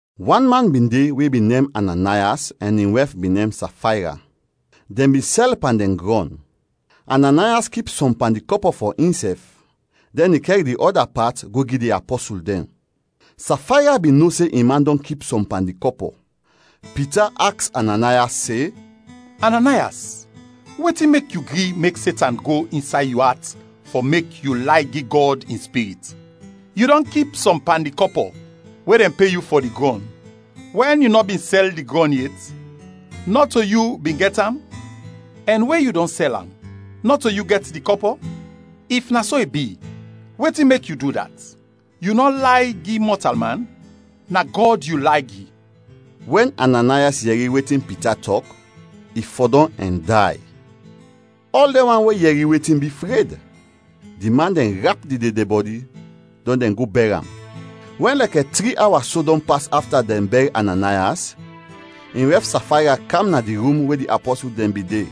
Wan man bin de we bin nem Ananayas ɛn in wɛf bin nem Safayra. Dɛn bin sɛl pan dɛn grɔn. Ananayas kip sɔm pan di kɔpɔ fɔ insɛf, dɛn i kɛr di ɔda pat go gi di apɔsul dɛn. Safayra bin no se in man dɔn kip sɔm pan di kɔpɔ. Pita aks Ananayas se, “Ananayas, wetin mek yu gri mek Setan go insay yu at fɔ mek yu lay gi Gɔd in Spirit? Yu dɔn kip sɔm pan di kɔpɔ we dɛn pe yu fɔ di grɔn! Wɛn yu nɔ bin sɛl di grɔn yet, nɔto yu bin gɛt am, ɛn we yu dɔn sɛl am, nɔto yu gɛt di kɔpɔ? If na so i bi, wetin mek yu du dat? Yu nɔ lay gi mɔtalman, na Gɔd yu lay gi!” Wɛn Ananayas yɛri wetin Pita tɔk, i fɔdɔm ɛn day. Ɔl dɛn wan we yɛri wetin bi, fred. Di man dɛn rap di dedebɔdi, dɔn dɛn go bɛr am. Wɛn lɛkɛ tri awa so dɔn pas afta dɛn bɛr Ananayas, in wɛf Safayra kam na di rum we di apɔsul dɛn bin de,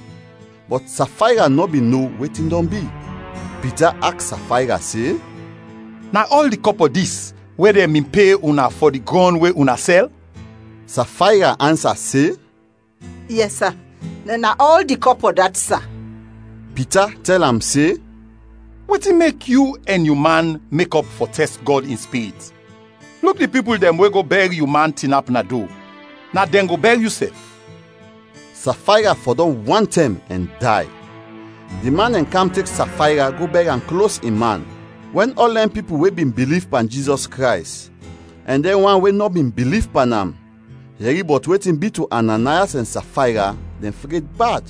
bɔt Safayra nɔ bin no wetin dɔn bi. Pita aks Safayra se, “Na ɔl di kɔpɔ dis we dɛn bin pe una fɔ da grɔn we una sɛl?” Safayra ansa se, “Yɛs, sa, na ɔl di kɔpɔ dat, sa.” Pita tɛl am se, “Wetin mek yu ɛn yu man mekɔp fɔ tɛst Gɔd in Spirit? Luk di pipul dɛn we go bɛr yu man tinap na do, na dɛn go bɛr yusɛf!” Safayra fɔdɔm wantɛm ɛn day. Di man dɛn kam tek Safayra go bɛr am klos in man. Wɛn ɔl dɛn pipul we bin biliv pan Jizɔs Krays ɛn dɛn wan we nɔ bin biliv pan am, yɛri bɔt wetin bi to Ananayas ɛn Safayra, dɛn fred bad.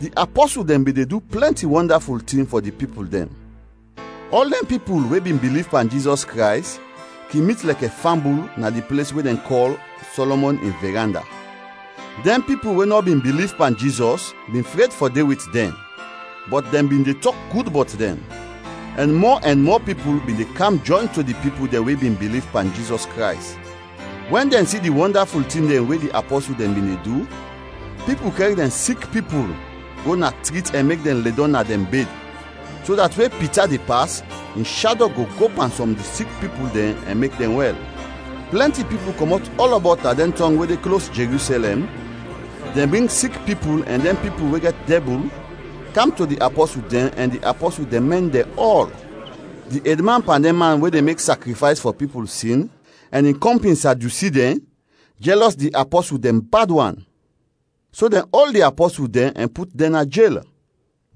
Di apɔsul dɛn bin de du plɛnti wɔndaful tin fɔ di pipul dɛn. Ɔl dɛn pipul we bin biliv pan Jizɔs Krays kin mit lɛkɛ fambul na di ples we dɛn kɔl Sɔlɔmɔn in Viranda. Dɛn pipul we nɔ bin biliv pan Jizɔs bin fred fɔ de wit dɛn, bɔt dɛn bin de tɔk gud bɔt dɛn. Ɛn mɔ ɛn mɔ pipul bin de kam jɔyn to di pipul dɛn we bin biliv pan Jizɔs Krays. Wɛn dɛn si di wɔndaful tin dɛn we di apɔsul dɛn bin de du, pipul kɛr dɛn sik pipul go na trit ɛn mek dɛn ledɔm na dɛn bed, so dat we Pita de pas, in shado go go pan sɔm di sik pipul dɛn ɛn mek dɛn wɛl. Plɛnti pipul kɔmɔt ɔlɔbɔt na dɛn tɔng we de klos Jerusɛlɛm, dɛn bring sik pipul ɛn dɛn pipul we gɛt dɛbul kam to di apɔsul dɛn ɛn di apɔsul dɛn mɛn dɛn ɔl. Di edman pan dɛn man we de mek sakrifays fɔ pipul sin, ɛn in kɔmpin Sadyusi dɛn, jɛlɔs di apɔsul dɛn bad wan. So dɛn ol di apɔsul dɛn ɛn put dɛn na jel.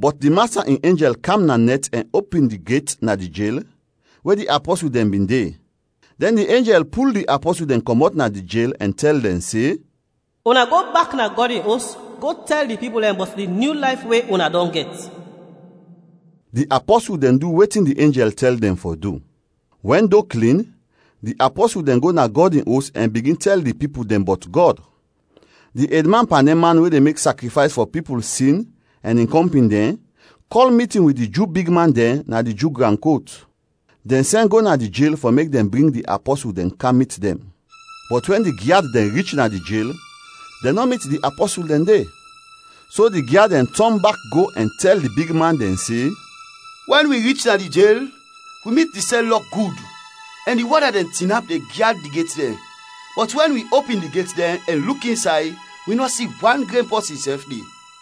Bɔt di Masta in enjɛl kam na nɛt ɛn opin di get na di jel we di apɔsul dɛn bin de, dɛn di enjɛl pul di apɔsul dɛn kɔmɔt na di jel ɛn tɛl dɛn se, “Una go bak na Gɔd in Os go tɛl di pipul dɛn bɔt di nyu layf we una dɔn gɛt.” Di apɔsul dɛn du wetin di enjɛl tɛl dɛn fɔ du. Wɛn do klin di apɔsul dɛn go na Gɔd in Os ɛn bigin tɛl di pipul dɛn bɔt Gɔd. Di edman pan dɛn man we de mek sakrifays fɔ pipul sin ɛn in kɔmpin dɛn kɔl mitin wit di Ju bigman dɛn na di Ju gran kot; dɛn sɛn go na di jel fɔ mek dɛn bring di apɔsul dɛn kam mit dɛn. Bɔt wɛn di gyad dɛn rich na di jel, dɛn nɔ mit di apɔsul dɛn de. So di gyad dɛn tɔn bak go ɛn tɛl di bigman dɛn se, “Wɛn wi rich na di jel, wi mit di sɛl lɔk gud ɛn di wɔda dɛn tinap de gyad di get dɛn; bɔt wɛn wi opin di get dɛn ɛn luk insay, wi nɔ si wan gren pɔsin sɛf de!”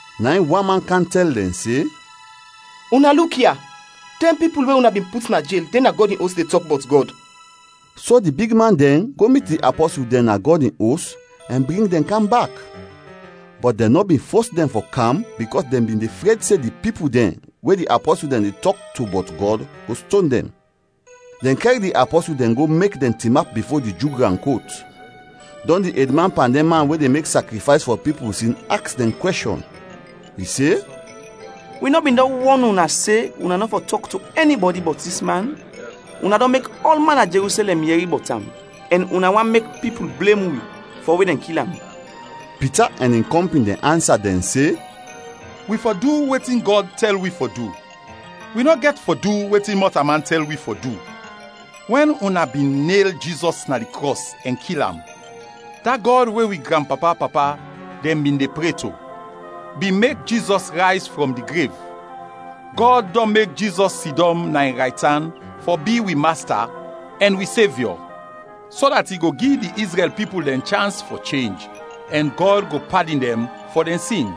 Na in wan man kam tɛl dɛn se, “Una luk ya! Dɛn pipul we una bin put na jel, de na Gɔd in Os de tɔk bɔt Gɔd.” So di bigman dɛn go mit di apɔsul dɛn na Gɔd in Os ɛn bring dɛn kam bak, bɔt dɛn nɔ bin fos dɛn fɔ kam bikɔs dɛn bin de fred se di pipul dɛn we di apɔsul dɛn de tɔk to bɔt Gɔd, go ston dɛn. Dɛn kɛr di apɔsul dɛn go mek dɛn tinap bifo di Ju gran kot, dɔn di edman pan dɛn man we de mek sakrifays fɔ pipul sin aks dɛn kwɛshɔn. I se, “Wi nɔ bin dɔn wɔn una se una nɔ fɔ tɔk to ɛnibɔdi bɔt dis man? Una dɔn mek ɔlman na Jerusɛlɛm yɛri bɔt am ɛn una want mek pipul blem wi fɔ we dɛn kil am.” Pita ɛn in kɔmpin dɛn ansa dɛn se, “Wi fɔ du wetin Gɔd tɛl wi fɔ du, wi nɔ gɛt fɔ du wetin mɔtalman tɛl wi fɔ du. Wɛn una bin nel Jizɔs na di krɔs ɛn kil am, da Gɔd we wi granpapa-papa dɛn bin de pre to, bin mek Jizɔs rayz frɔm di grev. Gɔd dɔn mek Jizɔs sidɔm na in raytan fɔ bi wi Masta ɛn wi Sevyɔ, so dat i go gi di Izrɛl pipul dɛn chans fɔ chenj ɛn Gɔd go padin dɛn fɔ dɛn sin.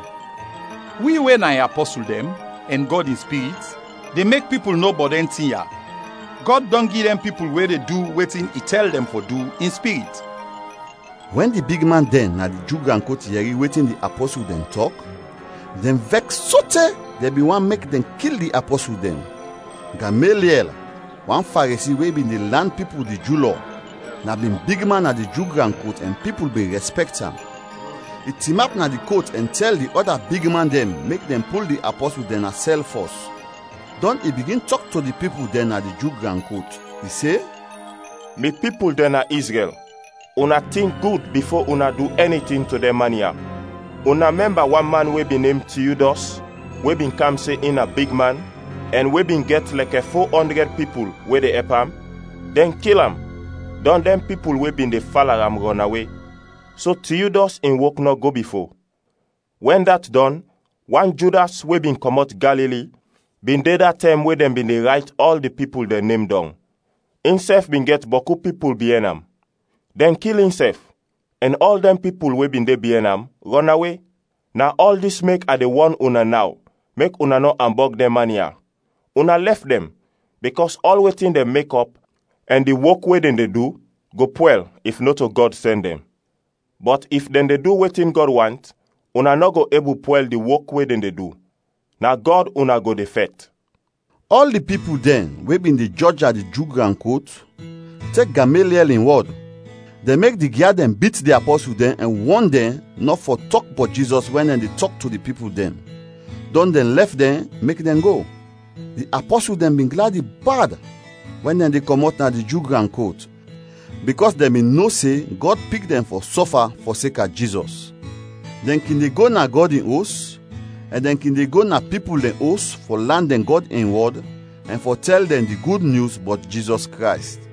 Wi, we na in apɔsul dɛn, ɛn Gɔd in Spirit, de mek pipul no bɔt dɛn tin ya. Gɔd dɔn gi dɛn pipul we de du wetin i tɛl dɛn fɔ du, in Spirit.” Wɛn di bigman dɛn na di Ju gran kot yɛri wetin di apɔsul dɛn tɔk, dɛn vɛks sote dɛn bin want mek dɛn kil di apɔsul dɛn. Gameliɛl, wan Faresi we bin de lan pipul di Ju Lɔ, na bin bigman na di Ju gran kot ɛn pipul bin rɛspɛkt am. I tinap na di kot ɛn tɛl di ɔda bigman dɛn mek dɛn pul di apɔsul dɛn na sɛl fɔs. Dɔn i bigin tɔk to di pipul dɛn na di Ju gran kot. I se, “Mi pipul dɛn na Izrɛl, una tink gud bifo una du ɛni tin to dɛn man ya. Una mɛmba wan man we bin nem Tiudɔs we bin kam se in na bigman ɛn we bin gɛt lɛkɛ fo ɔndrɛd pipul we de ɛp am. Dɛn kil am, dɔn dɛn pipul we bin de fala am rɔnawe; so Tiudɔs in wok nɔ go bifo. Wɛn dat dɔn, wan Judas, we bin kɔmɔt Galili, bin de da tɛm we dɛn bin de rayt ɔl di pipul dɛn nem dɔng. Insɛf bin gɛt bɔku pipul biɛn am. Dɛn kil insɛf ɛn ɔl dɛn pipul we bin de biɛn am, rɔnawe. Na ɔl dis mek a de wɔn una naw mek una nɔ ambɔg dɛn man ya, una lɛf dɛn, bikɔs ɔl wetin dɛn mekɔp ɛn di wok we dɛn de du, go pwɛl, if nɔto Gɔd sɛn dɛn. Bɔt if dɛn de du wetin Gɔd want, una nɔ go ebul pwɛl di wok we dɛn de du, na Gɔd una go de fɛt!” Ɔl di pipul dɛn we bin de jɔj na di Ju gran kot tek Gameliɛl in wɔd. Dɛn mek di gyad dɛn bit di apɔsul dɛn ɛn wɔn dɛn nɔ fɔ tɔk bɔt Jizɔs wɛn dɛn de tɔk to di pipul dɛn, dɔn dɛn lɛf dɛn, mek dɛn go. Di apɔsul dɛn bin gladi bad wɛn dɛn de kɔmɔt na di Ju gran kot bikɔs dɛn bin no se Gɔd pik dɛn fɔ sɔfa fɔseka Jizɔs. Dɛn kin de go na Gɔd in Os ɛn dɛn kin de go na pipul dɛn os fɔ lan dɛn Gɔd in wɔd ɛn fɔ tɛl dɛn di Gud Nyus bɔt Jizɔs Krays.